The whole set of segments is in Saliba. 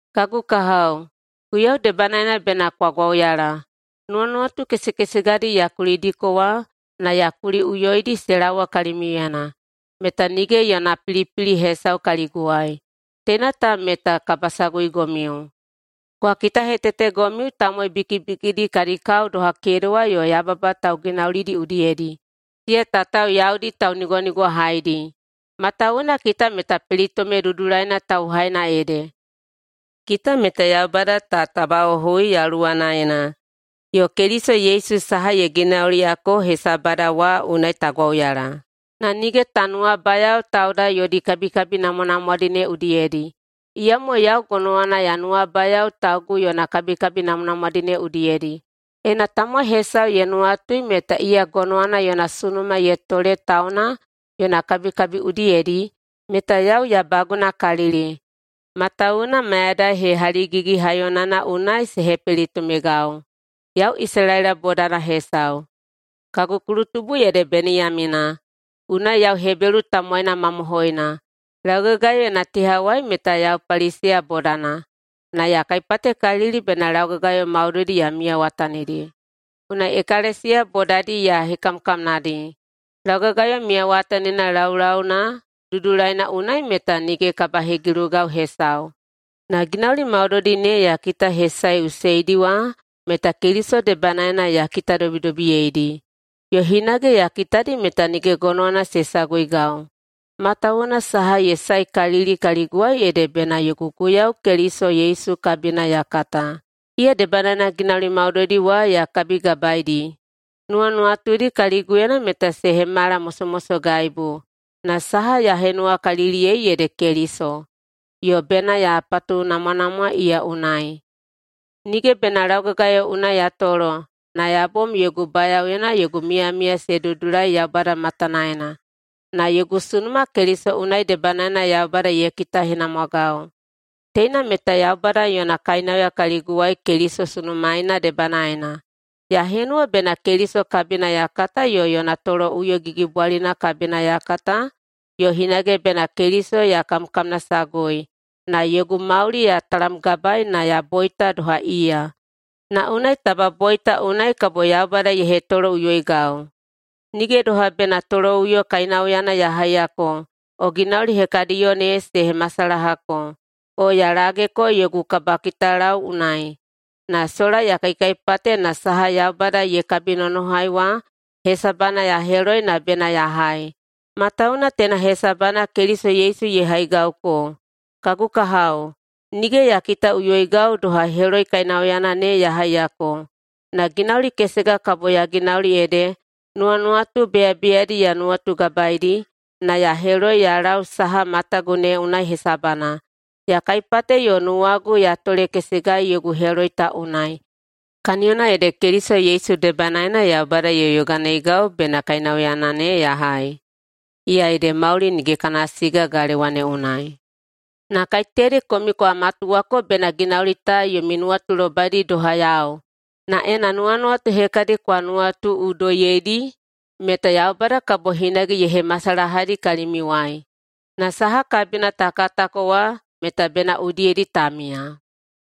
Kagu kahao, Guiyau debanaena bena kwa gwauyala. Nuwanuwatu kesekesegadi ya kulidiko wa na ya kuliꞌuyoidi se laowa kalimiuyena meta nige yona pilipili hesau kaliguwai. Teina ta meta kabasaguigomiu. Kwa kitahetetegomiu tamowai bikibikidi kadi kao doha kedewa yo yababa tauginaulidi udiyedi, siya tatao yaudi taunigwanigwahaidi. Matawuwuna kita meta pelitome dudulaina tauhaina ede. Kita meta Yaubada ta tabaꞌohui Yaluwanaena, yo Keliso Yesu saha ye ginauliyako hesabada wa unai ta gwauyala. Na nige ta nuwabayao tauda yodi kabikabi namwanamwadi ne udiyedi. Iyamo yau gonowana ya nuwabayao taugu yona kabikabi namwanamwadi ne udiyedi. Ena tamowai hesau ye nuwatui meta iya gonowana yona sunuma ye tole tauna yona kabikabi udiyedi, meta yau ya bagunakalili. Matawuwuna mayadai hehaligigi-haiyonana unai se hepelitomegau, yau Isalaela bodana hesau, kagu kulutubu ede Beniyamina, unai yau Hebelu tamowaina mamohoina. Laugagayo yona tehawai meta yau Paliseya bodana na ya kaipatekalili bena laugagayo maudoidi ya miyawatanidi. Unai ekalesiya bodadi ya hekamkamnadi. Laugagayo miyawatanina laulauna dudulaina unai meta nige kabahegilugau hesau. Na ginauli maudoidi ne ya kitahesaeꞌuseidi wa meta Keliso debanaena ya kitadobidobiyeidi. Yo hinage ya kitadi meta nige gonowana se saguigau, matawuwuna saha ye saekalili kaliguwai ede bena yogu Guiyau Keliso Yesu kabina ya kata. Iya debanaena ginauli maudoidi wa ya kabigabaeidi. Nuwanuwatudi kaliguyena meta se hemala mosomosogaibu, na saha ya henuwakaliliyei ede Keliso, yo bena ya patunamwanamwa iya unai. Nige bena laugagayo unai ya tolo na ya bom yogu bayaoyena yogu miyamiya se dudulai Yaubada matanaena, na yogu sunuma Keliso unai debanaena Yaubada ye kitahenamwagau. Teina meta Yaubada yona kainauya kaliguwai Keliso sunumaeina debanaena. Ya henuwa bena Keliso kabina ya kata yo yona toloꞌuyo gigibwalina kabina ya kata yo hinage bena Keliso ya kamkamnasagui na yogu mauli ya talamgabaei na ya boita doha iya, na unai taba boita unai kabo Yaubada ye hetoloꞌuyoigau. Nige doha bena [toloꞌuyo kainauyana ya haiyako o ginauli hekadiyo ne se masalahako] o ya lageko yogu kabakitalau unai. Na sola ya kaikaipate na saha Yaubada ye kabinonohai wa hesabana ya heloi na bena ya hai, matawuwuna teina hesabana Keliso Yesu ye haigauko. Kagu kahao, nige ya kitaꞌuyoigau doha heloi kainauyana ne ya haiyako. Na ginauli kesega kabo ya ginauli ede, nuwanuwatu beyabeyadi ya nuwagabaeidi na ya heloi ya lau saha matagu ne unai hesabana. Ya kaipate yo nuwagu ya tolekesegai yogu heloi ta unai. Kaniyona ede Keliso Yesu debanaena Yaubada ye yoganeigau bena kainauyana ne ya hai, iya ede mauli nige kana siga galewa ne unai. Na kaiteyadi komiu kwa matuwako bena ginauli ta yomi nuwatulobaidi doha yau. Na ena nuwanuwatu hekadi kwa nuwatuꞌudoiyeidi, meta Yaubada kabo hinage ye hemasalahadi kalimiuwai. Na saha kabina ta katako wa meta bena udiyedi ta miya.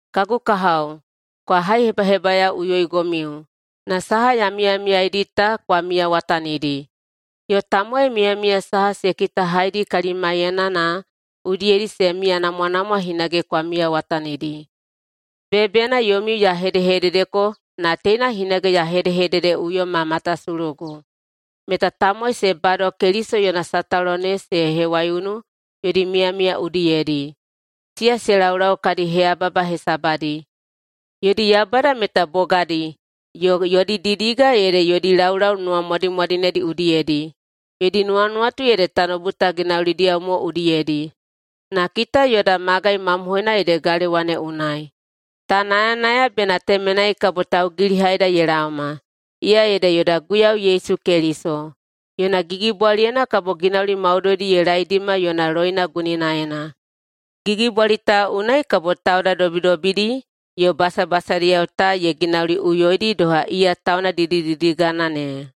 Kagu kahao, kwa haihebahebayaoꞌuyoigomiu na saha ya miyamiyaeidi ta kwa miyawatanidi. Yo tamowai miyamiya saha se kitahaidi kalimaiyena na udiyedi se miyanamwanamwa hinage kwa miyawatanidi. Beyabeyana yomiu ya hedehededeko na teina hinage ya hedehededeꞌuyoi ma matasulugu, meta tamowai se bado Keliso yona sataulo ne se hewaiunu yodi miyamiya udiyedi. Siya se laulau kadi heyababa hesabadi. Yodi yaubada meta bogadi, yo yodi didiga ede yodi laulau nuwamwadimwadinedi udiyedi. Yodi nuwanuwatu ede tanoubu ta ginaulidiyao mo udiyedi. Na kita yoda magai mamohoina ede galewa ne unai. Ta nayanaya bena temenai kabo taugilihaida ye laoma, iya ede yoda Guiyau Yesu Keliso. Yona gigibwaliyena kabo ginauli maudoidi ye laedima yona loina guninaena. Gigibwali ta unai kabo tauda dobidobidi yo basabasadiyao ta ye ginauliꞌuyoidi doha iya tauna didididigana ne.